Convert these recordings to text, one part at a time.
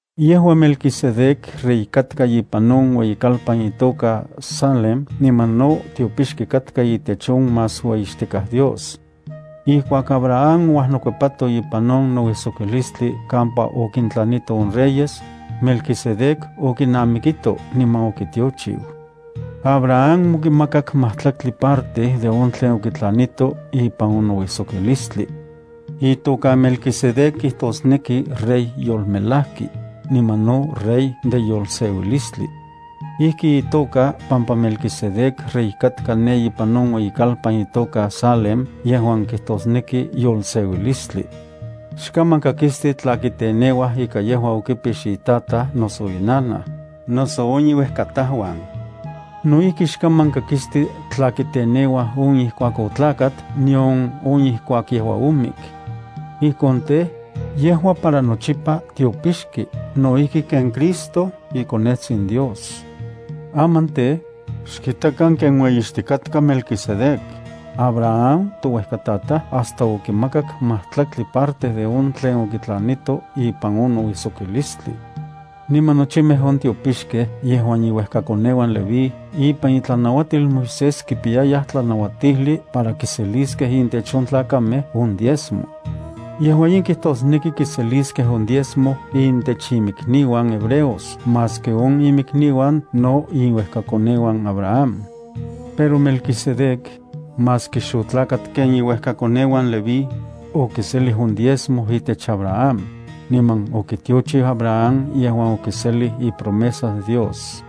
Yejua Melquisedec rey katka ipan on ueyikalpan itoka Salem niman no tiopixki katka itech on Más Ueyixtikaj Dios. Ijkuak Abraham ouajnokuepato ipan on nouijsokilistli kampa okintlanito on reyes, Melquisedec okinamikito niman okitiochiu. Abraham okimakak majtlaktli parte on tlen okitlanito ipan on nouijsokilistli. Itoka Melquisedec kijtosneki “rey yolmelajki”, niman no “rey de yolseuilistli”. Ijki itoka pampa Melquisedec rey katka ne ipan on ueyikalpan itoka Salem yejuan kijtosneki “yolseuilistli”. Xkaman kakisti tla kiteneuaj ika yejua okipix itataj, noso inanaj, noso on iuejkatajuan. No ijki xkaman kakisti tla kiteneuaj on ijkuak otlakat nion on ijkuak yejua omik. Ijkon tej, yejua para nochipa tiopixki no ijki ken Christo, iKonetsin Dios. Aman tej, ¡xkitakan ken ueyixtikatka Melquisedec! Abraham touejkatataj hasta okimakak majtlaktli parte de on tlen okitlanito ipan on nouijsokilistli. Niman nochimej on tiopixkej yejuan iuejkakoneuan Leví ipan itlanauatil Moisés kipiyayaj tlanauatijli para kiseliskej intech on tlakamej on diezmo. Yejua in kijtosneki kiseliskej on diezmo intech inmikniuan hebreos maski on inmikniuan no iuejkakoneuan Abraham. Pero Melquisedec, maski xotlakat ken iuejkakoneuan Leví, okiselij on diezmo itech Abraham, niman okitiochiu Abraham yejuan okinselij ipromesas Dios.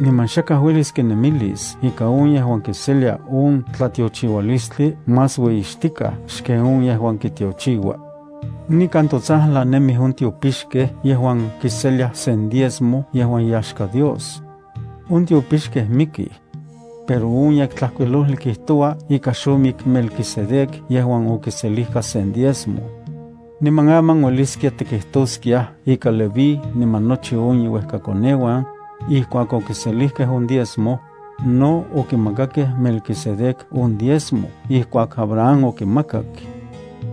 Niman xakaj uelis kinemilis ika on yejuan kiselia on tlatiochiualistli más ueyixtikaj xken on yejuan kitiochiua. Nikan totsajlan nemij on tiopixkej yejuan kiseliaj sen diezmo yejuan iyaxka Dios. On tiopixkej mikij. Pero on Yektlajkuilojli kijtoua ika xomik Melquisedec yejuan okiselijka sen diezmo. Niman aman ueliskia tikijtoskiaj ika Leví niman nochi on iuejkakoneuan, ijkuak okiselijkej on diezmo, no okimakakej Melquisedec on diezmo ijkuak Abraham okimakak.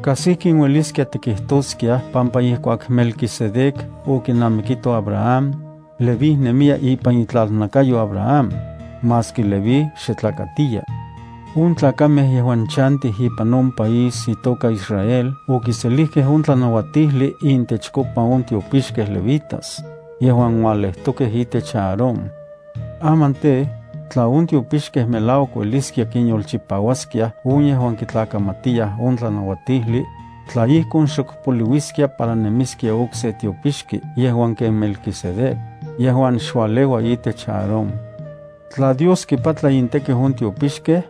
Kas ijkin ueliskia tikijtoskiaj pampa ijkuak Melquisedec okinamikito Abraham, Leví nemiya ipan itlanakayo Abraham, maski Leví xe tlakatiya. On tlakamej yejuan chantij ipan on país itoka Israel okiselijkej on tlanauatijli intechkopa on tiopixkej levitas, yejuan ualejtokej itech Aarón. Aman tej, tla on tiopixkej melauak ueliskiaj kinyolchipauaskiaj on yejuan kitlakamatiyaj on tlanauatijli, tla ijkon xok poliuiskia para nemiskia okse tiopixki yejuan ken Melquisedec, yejuan xualeua itech Aarón. Tla Dios kipatla intekiu on tiopixkej,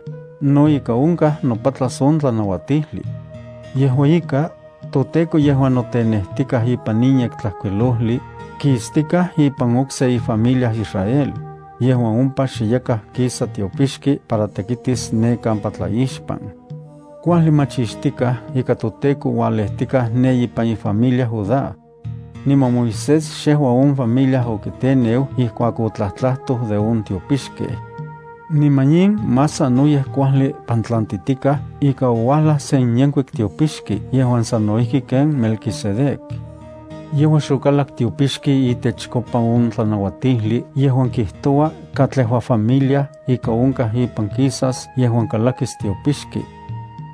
no ika onkaj nopatlas on tlanauatijli. Yejua ika, toTEKO yejuan notenejtikaj ipan in Yektlajkuilojli, kistikaj ipan okse ifamilia Israel, yejuan ompa xe yakaj kisa tiopixki para tekitis ne kampa tlaixpan. Kuajli machixtikaj ika toTEKO ualejtikaj ne ipan ifamilia Judá. Niman Moisés xejua on familia okiteneu ijkuak otlajtlajtoj de on tiopixkej. Niman in más sanoyej kuajli pantlantitikaj ika ouajlaj sen yenkuik tiopixki yejuan sano ijki ken Melquisedec. Yejua xokalak tiopixki itechkopa on tlanauatijli yejuan kijtoua katlejua familia ika onkaj ipan kisas yejuan kalakis tiopixki.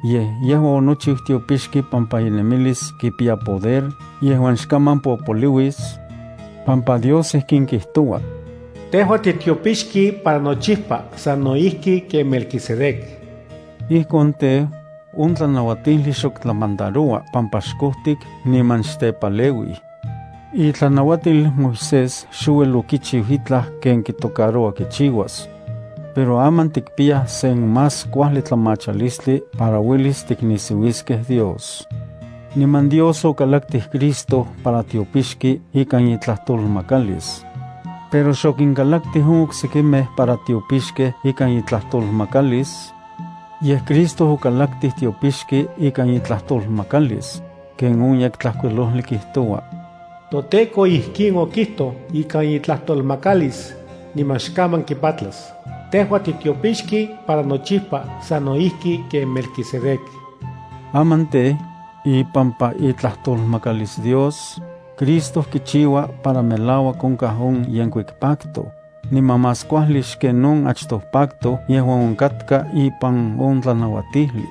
Yej yejua onochiu tiopixki pampa inemilis kipiya poder yejuan xkaman popoliuis, pampa Dios ijkin kijtoua: Tejua titiopixki para nochipa sano ijki ken Melquisedec. Ijkon tej, on tlanauatijli xok tlamandaroua pampa xkojtik niman xtepaleuij. Itlanauatil Moisés xouel okichiu itlaj ken kitocaroua kichiuas. Pero aman tikpiyaj sen más kuajli tlamachalistli para uelis tiknisiuiskej Dios. Niman Dios okalaktij Cristo para tiopixki ikan itlajtolmakalis. Pero xokinkalaktij on oksekimej para tiopixkej ikan itlajtolmakalis, yej Cristo okalaktij tiopixki ikan itlajtolmakalis, ken on Yektlajkuilojli kijtoua: ToTEKO ijkin okijtoj ikan itlajtolmakalis, niman xkaman kipatlas: “Tejua titiopixki para nochipa sano ijki ken Melquisedec.” Aman tej, ipampa itlajtolmakalis Dios, Cristo kichiua para melauak onkaj on yenkuik pacto, niman más kuajli xken on achtoj pacto yejuan onkatka ipan on tlanauatijli.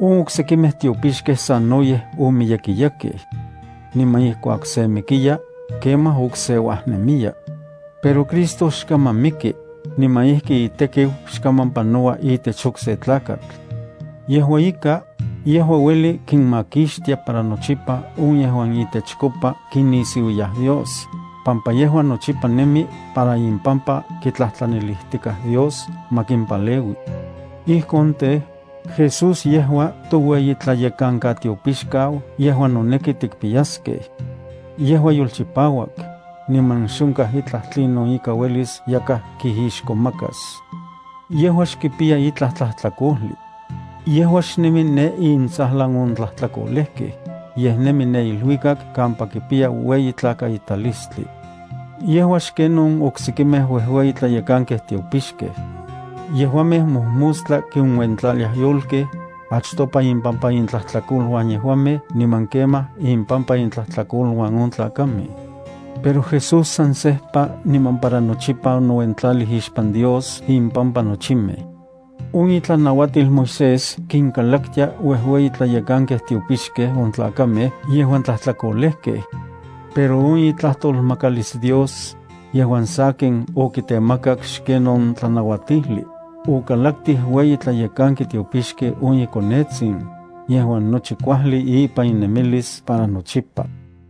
On oksekimej tiopixkej sanoyej omiyekiyakej. Niman ijkuak se mikiya, kemaj okse uajnemiya. Pero Cristo xkaman miki, niman ijki itekiu xkaman panoua itech okse tlakatl. Yejua ika, yejua ueli kinmakixtia para nochipa on yejuan itechkopa kinisiuiyaj Dios, pampa yejua nochipa nemi para impampa kitlajtlanilijtikaj Dios ma kimpaleui. Ijkon tej, Jesús yejua toueyitlayekankatiopixkau yejuan noneki tikpiyaskej. Yejua yolchipauak, niman xonkaj itlaj tlinon ika uelis yakaj kijixkomakas. Yejua xkipiya itlaj tlajtlakojli. Yejua xnemi ne intsajlan on tlajtlakolejkej, yej nemi ne iluikak kampa kipiya ueyi tlakaitalistli. Yejua xken on oksekimej uejueyi tlayekankej tiopixkej. Yejuamej mojmostla kinuentlaliaj yolkej, achtopa impampa intlajtlakoluan yejuamej niman kemaj impampa intlajtlakoluan on tlakamej. Pero Jesús san sejpa niman para nochipa onouentlalij ixpan Dios impampa nochimej. On itlanauatil Moisés kinkalaktia uejueyi tlayekankej tiopixkej on tlakamej yejuan tlajtlakolejkej. Pero on itlajtolmakalis Dios, yejuan sakin okitemakak xken on tlanauatijli, okalaktij ueyi tlayekanki tiopixki on iKonetsin, yejuan nochi kuajli ipan inemilis para nochipa.